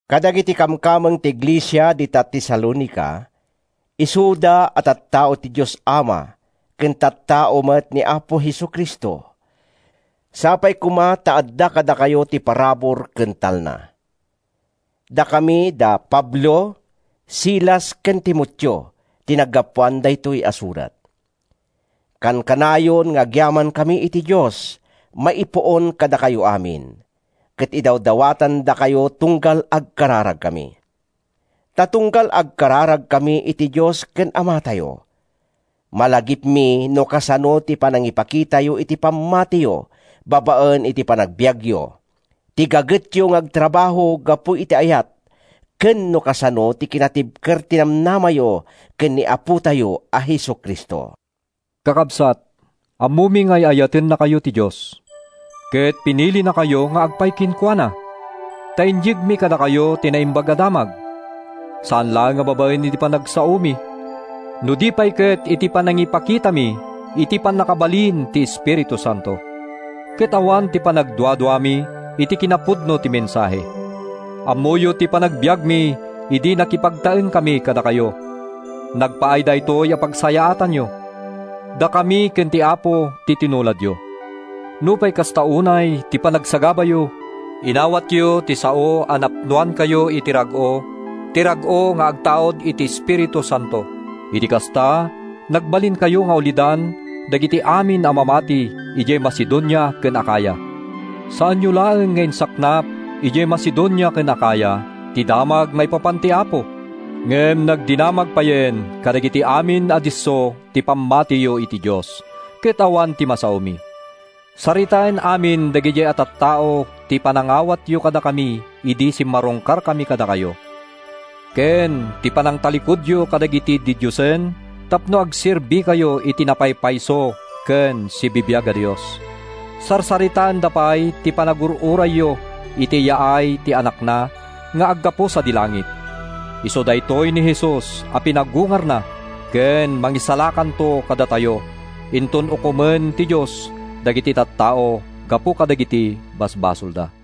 Kadagiti kamkameng ti iglesia dita Tesalonica, isuda a tattao ti Dios Ama ken tattao met ni Apo Jesu-Cristo, Sapay koma ta adda kadakayo ti parabur ken talna. Dakami, da Pablo, Silas ken Timoteo, ti naggapuan daytoy a surat. Kankanayon nga agyamankami iti Dios maipuon kadakayo amin, ket idawdawatandakayo tunggal agkararagkami. Ta tunggal agkararagkami iti Dios ken Amatayo, malagipmi no kasano ti panangipakitayo iti pammatiyo babaen iti panagbiagyo, ti gagetyo nga agtrabaho gapu iti ayat ken no kasano ti kinatibker ti namnamayo ken ni Apotayo a Jesu-Cristo. Kakabsat, ammomi nga ay-ayatennakayo ti Dios, ket pinilinakayo nga agpaay kenkuana. Ta inyegmi kadakayo ti Naimbag a Damag, saan laeng a babaen iti panagsaomi no di pay ket iti panangipakitami iti pannakabalin ti Espiritu Santo, ket awan panagduaduami iti kinapudno ti mensahe. Ammoyo ti panagbiagmi idi nakipagtaengkami kadakayo. Nagpaay daytoy a pagsayaatanyo. Dakami ken ti Apo ti tinuladyo. Nupay kasta unay ti panagsagabayo, inawatyo ti sao a napnoankayo iti rag-o, ti rag-o nga agtaud iti Espiritu Santo. Iti kasta, nagbalinkayo nga ulidan dagiti amin a mamati idiay Macedonia ken Acaya. Saanyo laeng nga insaknap idiay Macedonia ken Acaya ti damag maipapan iti Apo. Ngem nagdinamag payen kadagiti amin a disso ti pammatiyo iti Dios, ket awan ti masaomi. Saritaen amin dagidiay a tattao ti panangawatyo kadakami idi simmarungkarkami kadakayo, ken ti panangtallikudyo kadagiti didiosen tapno agserbikayo iti napaypayso ken sibibiag a Dios. Sarsaritaenda pay ti panagur-urayyo iti yaay ti Anakna nga aggapu sadi langit. Isu daytoy ni Jesus a pinagungarna ken mangisalakanto kadatayo inton ukomen ti Dios dagiti tattao gapu kadagiti basbasolda.